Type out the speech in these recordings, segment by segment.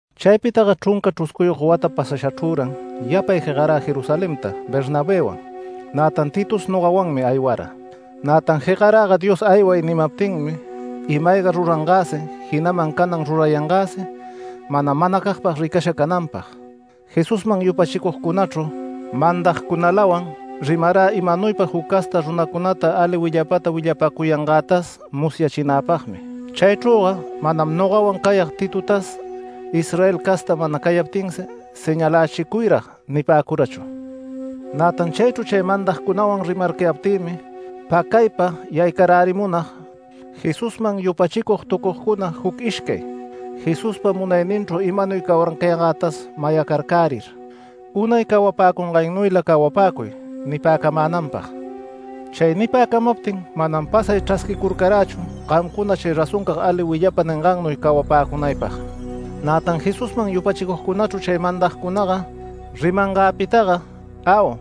Chaypitaga chrunca chruscuyog wata pasashachrüran yapay jegarä Jerusalenta Bernabëwan. Nätan Titos nogawanmi aywara. Nätan jegaräga Dios “Ayway” nimaptinmi, ima-ayga rurangäsi, jinaman canan rurayangäsi mana manacagpag ricasha cananpag. Jesusman yupachicugcunachru mandagcunalawan rimarä imanuypa juc casta runacunata ali willapata willapacuyangätas musyachinäpagmi. Chaychrüga manam nogawan cayag Titotas, Israel casta mana cayaptinsi “Señalächicuyrag” nipäcurachu. Nätan chaychru chay mandagcunawan rimararcayaptïmi pacaypa yaycarärimunag, Jesusman yupachicugtucugcuna juc ishcay, Jesuspa munayninchru imaynuy cawarcayangätas mayacarcärir, “Unay cawapäcungannuyla cawapäcuy” nipäcamänanpag. Chay nipäcamaptin manam pasay chrasquicurcarächu gamcuna chay razoncag ali willapa ningannuy cawapäcunaypag. Nätan Jesusman yupachicugcunachru chay mandagcunaga rimangäpitaga “Au,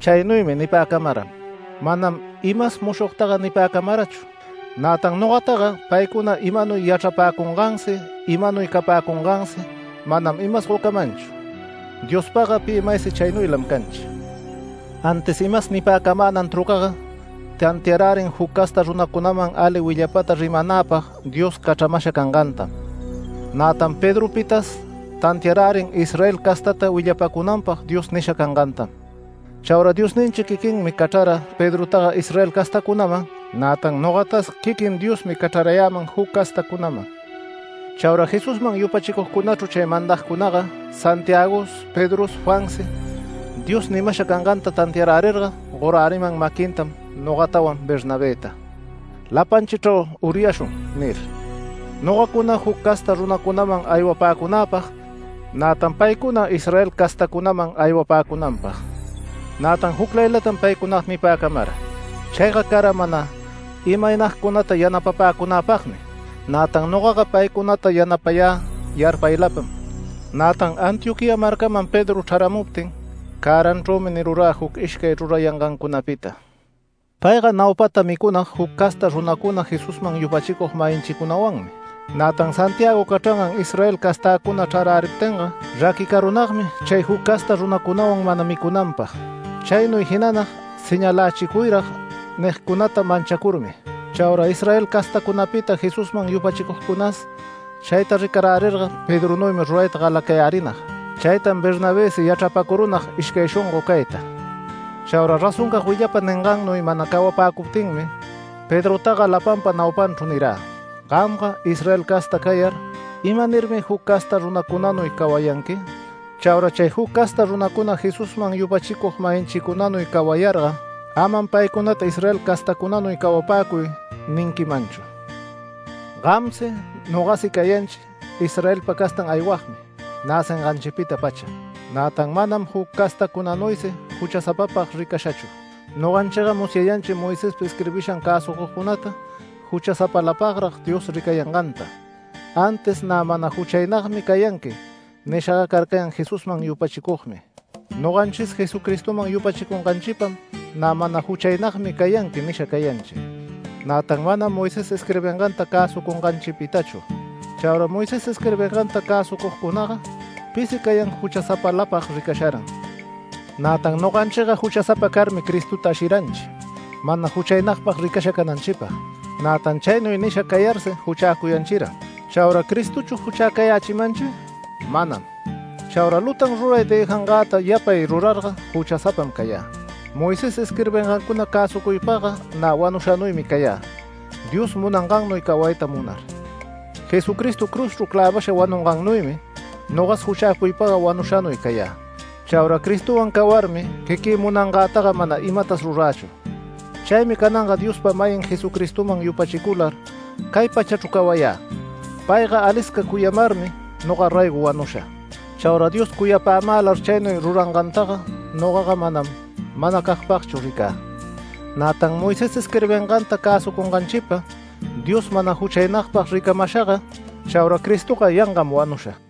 chaynuymi” nipäcamaram. Manam imas mushogtaga nipäcamarachu. Nätan nogataga paycuna imanuy yachrapäcungansi imanuy capäcungansi manam imas gocamanchu Diospagga pi maysi chaynuylam canchi. Antis imas nipäcamänan trucaga tantiarärin juc casta runacunaman ali willapata rimanäpag Dios cachramasha cangantam. Nätan Pedropitas tantiarärin Israel castata willapacunanpag Dios nisha cangantam. Chaura Diosninchi quiquinmi cachrara Pedrotaga Israel castacunaman, nätan nogatas quiquin Diosmi cachrarayäman juc castacunaman. Chaura Jesusman yupachicugcunachru chay mandagcunaga Santiagos Pedros Juansi Dios nimasha canganta tantiarärirga goräriman maquintam nogatawan Bernabëta. “Lapanchichrau uryashun” nir, nogacuna juc casta runacunaman aywapäcunäpag, nätan paycuna Israel castacunaman aywapäcunanpag. Nätan juclaylatam paycunaga nipäcamara. Chayga cara mana imaynagcunata yanapapäcunäpagmi. Nätan nogaga paycunata yanapayä yarpaylapam. Nätan Antioquía marcaman Pedro chraramuptin cäranchrümi nirurä, juc ishcay rurayangancunapita. Payga naupata micunag juc casta runacuna Jesusman yupachicug-mayinchicunawanmi, nätan Santiago cachrangan Israel castäcuna chraräriptinga raquicarunagmi chay juc casta runacunawan mana micunanpag. Chaynuy jinanag “Señalächicuyrag” nigcunata manchacurmi. Chaura Israel castacunapita Jesusman yupachicugcunas chayta ricarärirga Pedronuymi rurayta galayarärinag, chaytam Bernabësi yachrapacurunag ishcay shongo cayta. Chaura razoncag willapa ningannuy mana cawapäcuptinmi Pedrotaga lapanpa naupanchru nirä: “Gamga Israel casta cayar, ¿imanirmi juc casta runacunanuy cawayanqui? Chaura chay juc casta runacuna Jesusman yupachicug-mayinchicunanuy cawayarga, amam paycunata Israel castacunanuy cawapäcuy” ninquimanchu. Gamsi nogasi cayanchi Israelpa castan aywagmi näcinganchipita-pacha, nätan manam juc castacunanuysi juchasapapag ricashachu. Noganchiga musyayanchim Moisespa isquirbisham cäsucugcunata juchasapalapagrag Dios ricayanganta, antis “Nä mana juchaynagmi cayanqui” nishaga carcayan Jesusman yupachicugmi. Noganchis Jesucristoman yupachicunganchipam “Nä mana juchaynagmi cayanqui” nisha cayanchi, nätan manam Moisés isquirbinganta cäsucunganchipitachu. Chaura Moisés isquirbinganta cäsucugcunaga pisi cayan juchasapalapag ricasharan. Nätan noganchiga juchasapa carmi Cristota ashiranchi, mana juchaynagpag ricasha cananchipag. Nätan chaynuy nisha cayarsi juchäcuyanchiran. ¿Chaura Cristochu juchäcayächimanchi? Manam. Chaura lutan ruray dëjangäta yapay rurarga juchasapam cayä. Moisés isquirbingancuna cäsucuypagga nä wanushanuymi cayä Dios munangannuy cawayta munar. Jesucristo cruzchru clävasha wanungannuymi nogas juchäcuypagga wanushanuy cayä. Chaura Cristowan cawarmi quiquï munangätaga mana imatas rurächu. Chaymi cananga Diospa-mayin Jesucristoman yupachicular cay pachachru cawayä, payga alisca cuyamarmi noga raygo wanusha. Chaura Dios cuyapämälar chaynuy rurangantaga nogaga manam manacagpagchu ricä. Nätan Moisés isquirbinganta cäsucunganchipa Dios mana juchaynagpag ricamashaga, chaura Cristoga yangam wanusha.